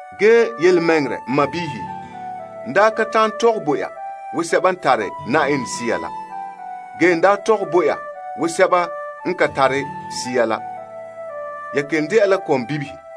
Ge yelemɛŋɛrɛ n sɔɔnrɔ, n daa ka ta'an tɔgɛ bo ya wo sɛba n tare Yenɛ Sea la. Ge n daa tɔgɛ bo ya wo sɛba n ka tare Sea la. Ya kelom dɛna la kɔmbibihe.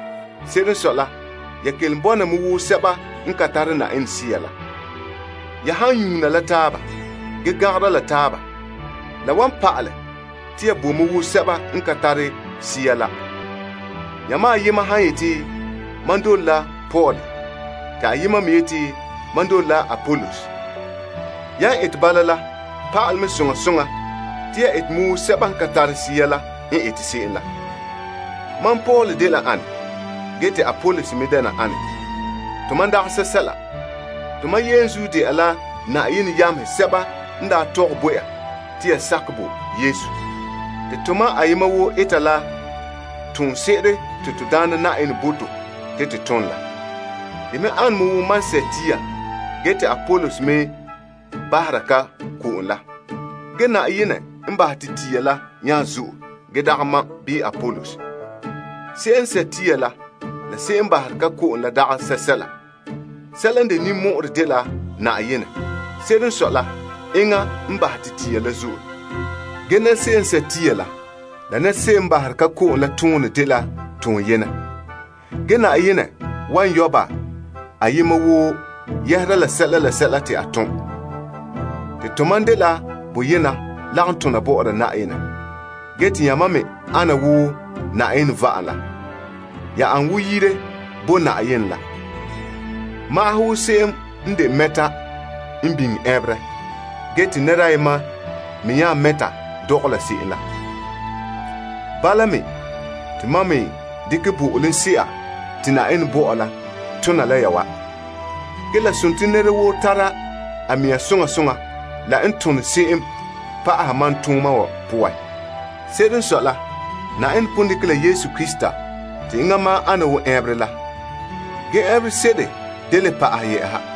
Se'ere n sɔe la, ya kelom bɔna me wo sɛba n ka tare Yenɛ Sea la. Ya han nyuuna la taaba, ge gangara la taaba, la wan pa'alɛ te ya bo mɛ wo sɛba n ka tare Sea la. Yamam ayema han yeti, Mam dole la Paul, te ayema me yeti, Mam dole la Apolos. Yan ete bala la, pa'alɛ mɛ soŋa soŋa te ya ete mɛ wo sɛba n ka tare Sea la n ete se'em la. Mam Paul dela ane? Ge te Apolos me dɛna ane? Tomam dagɛ sɛsɛla. Tomam yenzuo dɛna Na'ayenɛ yamehe sɛba n daa tɔgɛ bo ya te ya sakɛ bo Yesu. Te tomam ayema woo ete la toonse'ere te to Daana Na'ayenɛ bo to te to tom la. De me ane me wo mam n borɛ, te Apolos bahɛ ko'om. Ge Na'ayenɛ n bahɛ te la yɛhera na. Se'em n borɛ la, la se'em n bahere ko'om la dagɛ sɛsɛla. Sɛla n de ninmɔ'ɔrɛ dela Na'ayenɛ. Se'ere n sɔe la enŋa n bahɛ te la yɛhera. Ge se'em n borɛ la, la se'em n baherɛ ka ko'om la toonɛ dela toon yenɛ. Ge Na'ayenɛ wan yɔ' ba ayema woo yɛhera la sɛla la sɛla te a tom. Te tomam dela boyena lagom tona bɔ'ɔra Yenɛ, ge te yamam me ana wo Na'ayenɛ va'am la. Ya me le ana wo yire la bo Na'ayenɛ. Magahɛ wo se'em n de mɛta n biŋe ɛnberɛ, ge te nɛra ayema me nya mɛta dɔgɔla se'em la. Bala mea, te mam me dekɛ bo'olomse'a te Na'ayenɛ bo mam la tona la ya wa. Ge la dela nɛra woo tara a mea soŋa soŋa la n tone se'em pa'aha mam tooma wa poan. Se'ere n sɔe la, Na'ayenɛ pon dekɛ la Yesu Krista te enŋa ma'an n de ɛnberɛ, ge ɛnberɛ se'ere da le pa'ahɛ.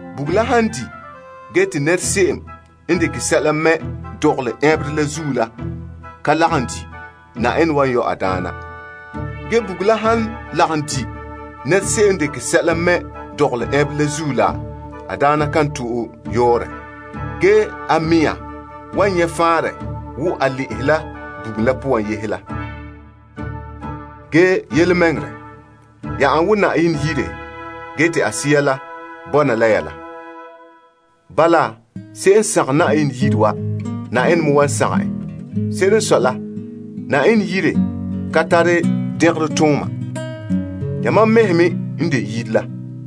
Bugum la han di, ge te se'em n dekɛ sɛla mɛ dɔgɔlɛ ɛnberɛ la zuo ka lagom di, Na'ayenɛ wan yɔ' a daana. Ge bugum la han lagom di se'em n dekɛ sɛla mɛ dɔgɔlɛ ɛnberɛ la zuo la, a daana kan tara sɛla. A mɛŋa wan nyɛ faanrɛ wo a peɛn la bugum poan la. Ge yelemɛŋɛrɛ, ya dela Yenɛ Yire te a Sea la bɔna la ya la. Bala, se'em n sagom Yenɛ Yire wa, Na'ayenɛ me wan sagom en. Se'ere n sɔe la, Yenɛ Yire dela toolom zen'an. Yamam mɛhe n de a Yire la.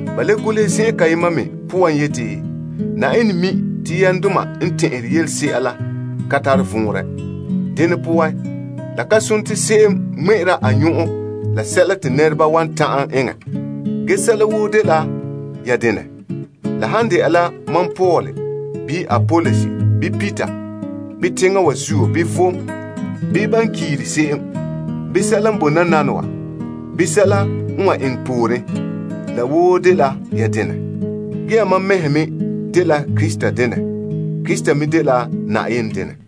Ba le golehɛ yeti, Na'ayenɛ mi te asaala tɛn'ɛhegɔ ka tare vɔnrɛ. Dene poan, la ka sone te se'em ŋmɛ'ɛra a nyɔn'ɔn la sɛla te nɛreba wan ta'an eŋɛ. Ge sɛla woo dela ya denɛ. La han dɛna la mam Paul, bii Apolos, bii Peter, bii teŋa wa zuo, bii vom, bii ban kiire se'em, bii sɛla n bo nananawa, bii sɛla n wan eŋɛ pooren, la woo dela ya denɛ. Ge yamam mɛhe me dela Krista denɛ. Krista me dela Na'ayenɛ denɛ.